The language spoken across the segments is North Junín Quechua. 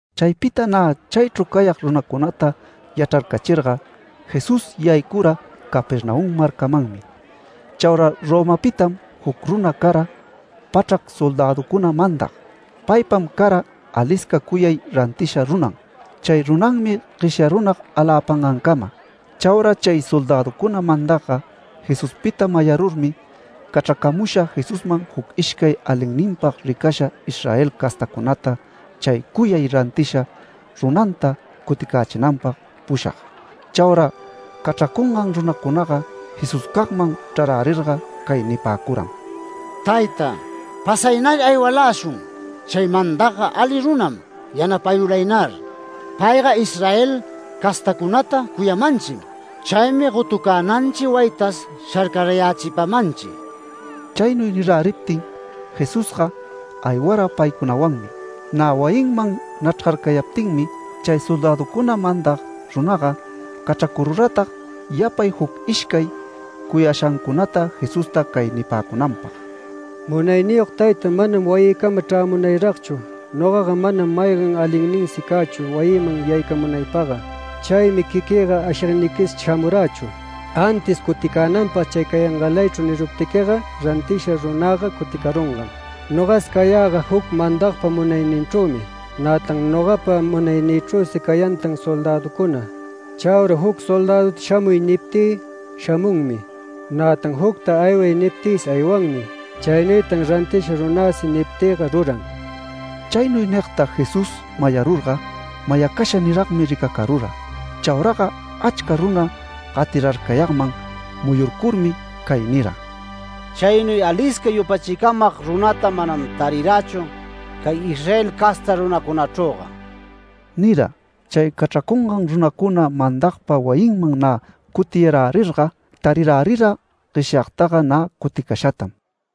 Chaypita nä chaychru cayag runacunata yachrarcachirga, Jesús yaycura Capernaum marcamanmi. Chaura Romapitam juc runa cara pachrac soldäducuna mandag. Paypam cara alisca cuyay rantisha runan. Chay runanmi gueshyarunag aläpangancama. Chaura chay soldäducuna mandagga Jesuspita mayarurmi, cachracamusha Jesusman juc ishcay alinninpag ricasha Israel castacunata chay cuyay rantisha runanta cuticächinanpag pushag. Chaura cachracungan runacunaga Jesuscagman chrarärirga cay nipäcuram: “Tayta, pasaynar aywaläshun, chay mandagga ali runam yanapayulaynar. Payga Israel castacunata cuyamanchim. Chaymi gotucänanchi wayitas sharcarayächipamanchi”. Chaynuy niräriptin Jesusga aywara paycunawanmi. Nä wayinman nachrgarcayaptinmi, chay soldäducuna mandag runaga cachracururatag yapay juc ishcay cuyashancunata Jesusta cay nipäcunanpag: “Munayniyog tayta, manam wayïcama chrämunayragchu. Nogaga manam maygan alinninsi cächu wayïman yaycamunaypagga. Chaymi quiquïga ashigniquis shamurächu, antis cuticänanpag chay cayangalaychru niruptiquiga rantisha runäga cuticarungam. Nogas cayäga juc mandagpa munayninchrümi. Nätan nogapa munaynïchrüsi cayantan soldäducuna. Chaura juc soldäduta ‘Shamuy’ niptï shamunmi. Nätan jucta ‘Ayway’ niptïsi aywanmi. Chaynuytan rantisha runäsi niptïga ruran”. Chaynuy nigta Jesús mayarurga, mayacasha niragmi ricacarura. Chauraga achca runa gatirarcayagman muyurcurmi cay nira: “Caynuy alisca yupachicamag runata manam tarirächu cay Israel casta runacunachrüga” nira. Chay cachracungan runacuna mandagpa wayinman nä cutiyarärirga tarirärira gueshyagtaga nä cuticashatam.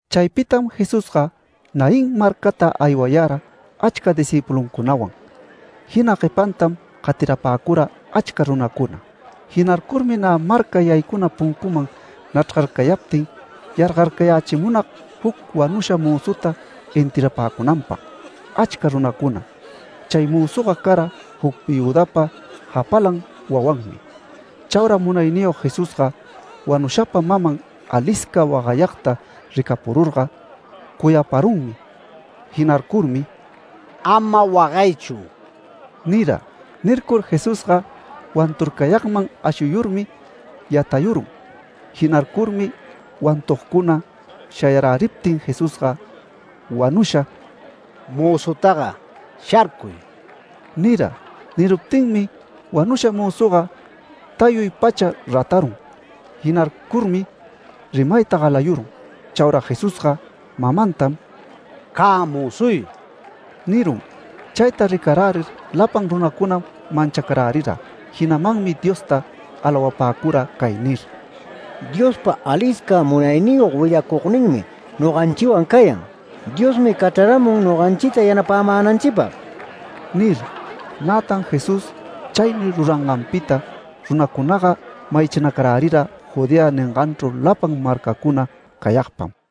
Chaypitam Jesusga Naín marcata aywayara achca discïpuluncunawan, jina guepantam gatirapäcura achca runacuna. Jinarcurmi nä marca yaycuna puncuman nachrgarcayaptin, yargarcayächimunag juc wanusha mözuta enterrapäcunanpag achca runacuna. Chay mözuga cara juc viüdapa japalan wawanmi. Chaura Munayniyog Jesusga wanushapa maman alisca wagayagta ricapururga cuyaparunmi. Jinarcurmi “Ama wagaychu” nira. Nircur Jesusga wanturcayagman ashuyurmi yatayurun. Jinarcurmi wantugcuna shayaräriptin Jesusga wanusha “Mözutaga, ¡sharcuy!” nira. Niruptinmi wanusha mözuga tayuy pacha ratarun. Jinarcurmi rimayta galayurun. Chaura Jesusga mamantam “Cä mözuy” nirun. Chayta ricarärir lapan runacunam manchacarärira. Jinamanmi Diosta alawapäcura cay nir: “Diospa alisca munayniyog willacugninmi noganchiwan cayan. Diosmi cachraramun noganchita yanapämänanchipag” nir. Nätan Jesús chaynuy ruranganpita runacunaga mayachinacarärira Judea ninganchru lapan marcacuna cayagpam.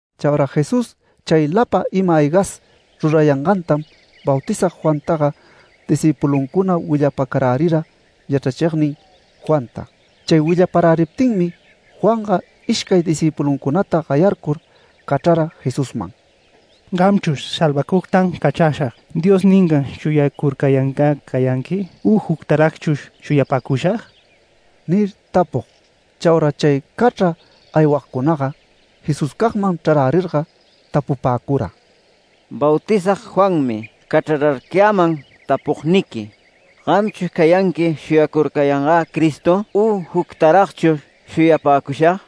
Chaura Jesús chay lapan ima-aygas rurayangantam Bautizag Juantaga discïpuluncuna willapacarärira yachrachignin Juanta. Chay willaparäriptinmi Juanga ishcay discïpuluncunata gayarcur cachrara Jesusman “¿Gamchush, ‘Salvacugtam cachrashag’ Diosga ningan shuyacurcayangä cayanqui u juctaragchush shuyapäcushag?” nir tapug. Chaura chay cachra aywagcunaga Jesuscagman chrarärirga tapupäcura: “Bautizag Juanmi cachrararcayäman tapugniqui, ‘¿Gamchush cayanqui shuyacurcayangä Cristo u juctaragchush shuyapäcushag?’”.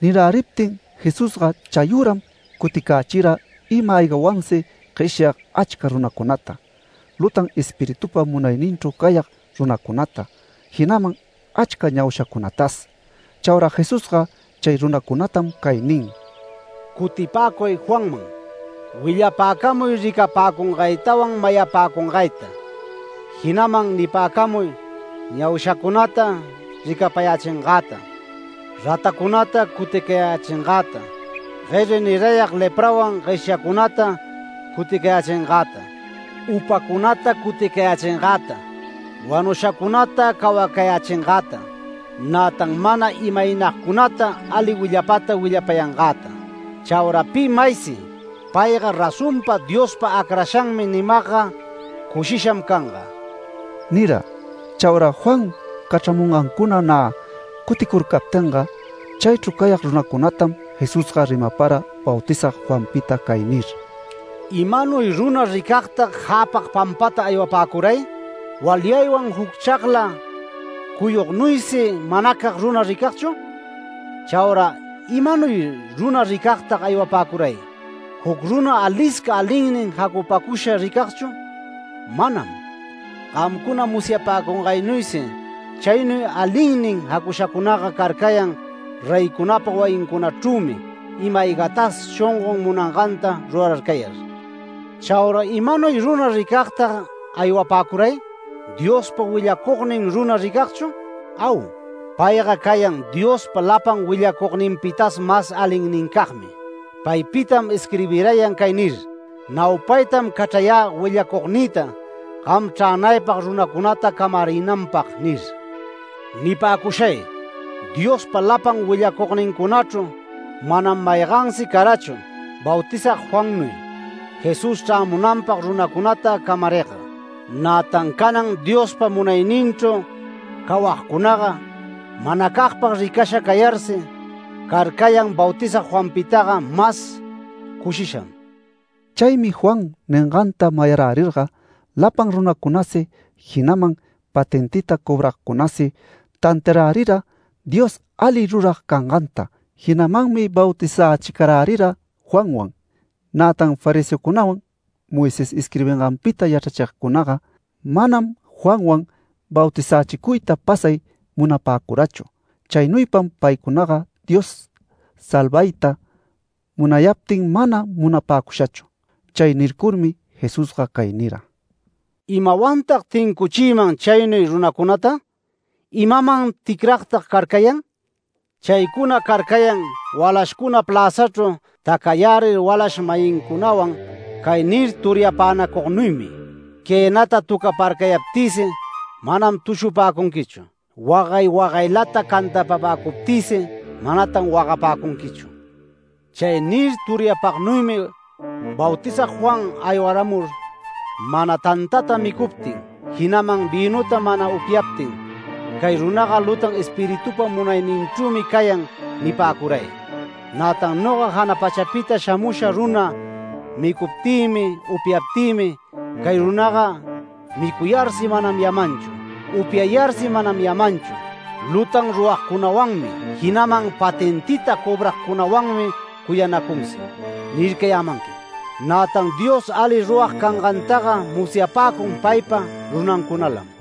Niräriptin Jesusga chayüram cuticächira ima-aygawansi gueshyag achca runacunata, lutan espiritupa munayninchru cayag runacunata, jinaman achca ñaushacunatas. Chaura Jesusga chay runacunatam cay nin: “Cutipäcuy Juanman. Willapäcamuy ricapäcungaytawan mayapäcungayta. Jinaman nipäcamuy ñaushacunata ricapayächingäta, ratacunata cuticayächingäta, gueri nirayag leprawan gueshyagcunata cuticayächingäta, upacunata cuticayächingäta, wanushacunata cawacayächingäta, nätan mana imaynagcunata ali willapata willapayangäta. Chaura pi maysi ‘Payga razonpa Diospa acrashanmi’ nimagga cushisham canga” nira. Chaura Juan cachramungancuna nä cuticurcaptinga, chaychru cayag runacunatam Jesusga rimapara Bautizag Juanpita cay nir: “¿Imanuy runa ricagtag jäpag pampata aywapäcuray? ¿Walyaywan juc chagla cuyugnuysi manacag runa ricagchu? Chaura ¿imanuy runa ricagtag aywapäcuray? ¿Juc runa alisca alinnin jacupäcusha ricagchu? Manam. Gamcuna musyapäcungaynuysi chaynuy alinnin jacushacunaga carcayan reycunapa wayincunachrümi ima-aygatas shongon munanganta rurarcayar. Chaura ¿imanuy runa ricagtag aywapäcuray? ¿Diospa willacugnin runa ricagchu? Au. Payga cayan Diospa lapan willacugninpitas mas alinnincagmi. Paypitam isquirbirayan cay nir: ‘Naupaytam cachrayä willacugnïta, gam chränaypag runacunata camarinanpag’ nir. Nipäcushay Diospa lapan willacugnincunachru manam maygansi carachu Bautizag Juannuy Jesús chrämunanpag runacunata camarigga. Nätan canan Diospa munayninchru cawagcunaga manacagpag ricasha cayarsi carcayan Bautizag Juanpitaga mas cushisham”. Chaymi Juan ninganta mayarärirga lapan runacunasi, jinaman patentita cobragcunasi tantiarärira Dios ali rurag canganta, jinamanmi bautizächicarärira Juanwan. Nätan fariseocunawan Moisés isquirbinganpita yachrachigcunaga, manam Juanwan bautizächicuyta pasay munapäcurachu. Chaynuypam paycunaga Dios salvayta munayaptin mana munapäcushachu. Chay nircurmi Jesusga cay nira: “¿Imawantag tincuchïman chaynuy runacunata? ¿Imaman ticragtag carcayan? Chaycuna carcayan walashcuna pläzachru tacayärir walash-mayincunawan cay nir turyapänacugnuymi: ‘Quënäta töcaparcayaptïsi manam tushupäcunquichu, wagay wagaylata cantapapäcuptïsi manatan wagapäcunquichu’. Chay nir turyapagnuymi Bautizag Juan aywaramur mana tantata micuptin, jinaman vïnuta mana upyaptin, ‘Cay runaga lutan espiritupa munayninchrümi cayan’ nipäcuray. Nätan noga jana pachapita shamusha runa micuptïmi upyaptïmi, ‘Cay runaga micuyarsi manam yamanchu, upyayarsi manam yamanchu. Lutan ruragcunawanmi, jinaman patentita cobragcunawanmi cuyanacunsi’ nircayämanqui. Nätan Dios ali rurag cangantaga musyapäcun paypa runancunalam”.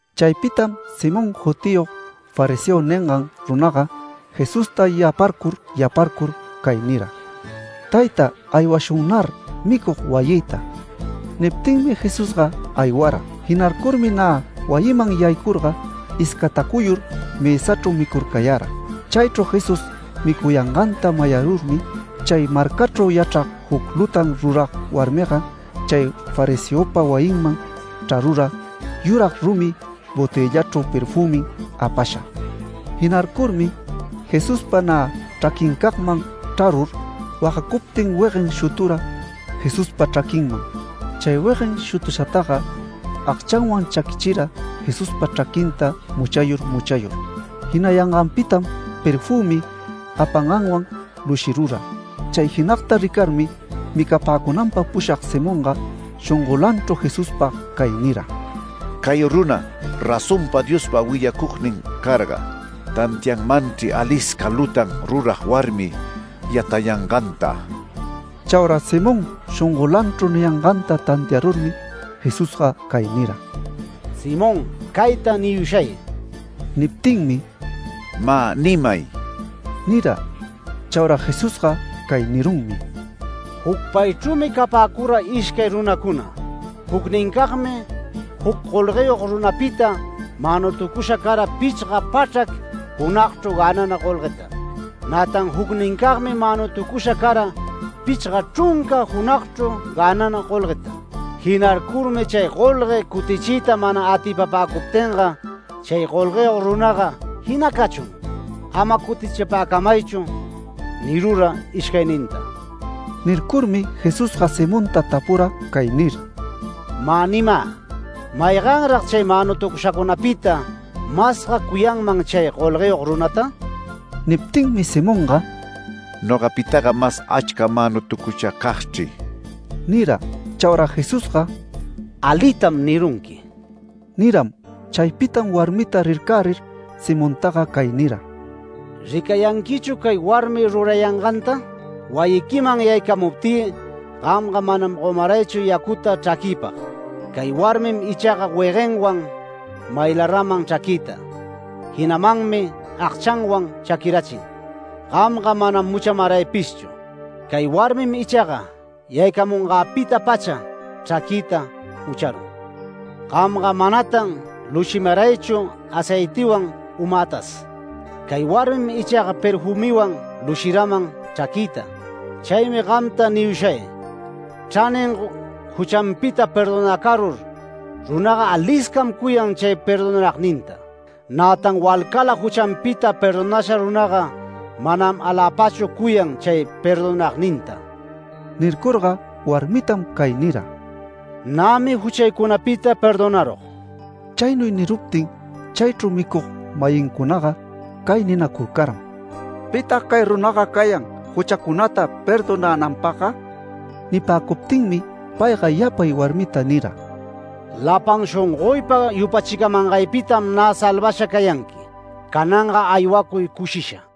Chaypitam Simón jutiyog fariseo ningan runaga, Jesusta yaparcur yaparcur cay nira: “Tayta, aywashunnar micug wayïta”. Niptinmi Jesusga aywara. Jinarcurmi nä wayiman yaycurga iscatacuyur mësachru micurcayara. Chaychru Jesús micuyanganta mayarurmi, chay marcachru yachrag juc lutan rurag warmiga, chay fariseopa wayinman chrarura yurag rumi botëllachru perfümin apasha. Jinarcurmi Jesuspa nä chraquincagman chrarur wagacuptin weguen shutura Jesuspa chraquinman. Chay weguen shutushataga agchanwan chaquichira Jesuspa chraquinta muchayur muchayur. Jinayanganpitam perfümi apanganwan lushirura. Chay jinagta ricarmi, micapäcunanpag pushag Simonga shongolanchru Jesuspag cay nira: “Cay runa razonpa Diospa willacugnin carga, tantianmanchri alisca lutan rurag warmi yatayanganta”. Chaura Simón shongolanchru niyanganta tantiarurmi Jesusga cay nira: “Simón, cayta niyushay”. Niptinmi “Mä nimay” nira. Chaura Jesusga cay nirunmi: “Jucpaychrümi capäcura ishcay runacuna. Jucnincagmi juc golgueyog runapita manutucusha cara pichga pachrac junagchru gänanan golgueta, nätan jucnincagmi manutucusha cara pichga chrunca junagchru gänanan golgueta. Jinarcurmi chay golgue cutichiyta mana atipapäcuptinga, chay golgueyog runaga ‘Jina cachun, ama cutichipäcamaychu’ nirura ishcayninta” Nircurmi Jesusga Simonta tapura cay nir: “Mä nimä, ¿mayganrag chay manutucushacunapita masga cuyanman chay golgueyog runata?” Niptinmi Simonga “Nogapitaga mas achca manutucushacagchri” nira. Chaura Jesusga “Alitam nirunqui” niram. Chaypitam warmita rircärir Simontaga cay nira: “¿Ricayanquichu cay warmi rurayanganta? Wayiquiman yaycamuptï gamga manam gomaraychu yacuta chraquïpag. Cay warmin ichaga weguenwan maylaraman chraquïta. Jinamanmi agchanwan chaquirachin. Gamga manam muchamaraypishchu. Cay warmim ichaga yaycamunganpita-pacha chraquïta mucharun. Gamga manatan lushimaraychu aceitiwan umätas. Cay warmim ichaga perfümiwan lushiraman chraquïta. Chaymi gamta niyushay, chranin juchanpita perdonacarur runaga aliscam cuyan chay perdonagninta. Nätan walcala juchanpita perdonasha runaga manam aläpachu cuyan chay perdonagninta”. Nircurga warmitam cay nira: “Nämi juchaycunapita perdonarug”. Chaynuy niruptin chaychru micug-mayincunaga cay ninacurcaram: “¿Pitag cay runaga cayan juchacunata perdonänanpagga?” Nipäcuptinmi payga yapay warmita nira: “Lapan shongoypa yupachicamangaypitam nä salvasha cayanqui. Cananga aywacuy cushisha”.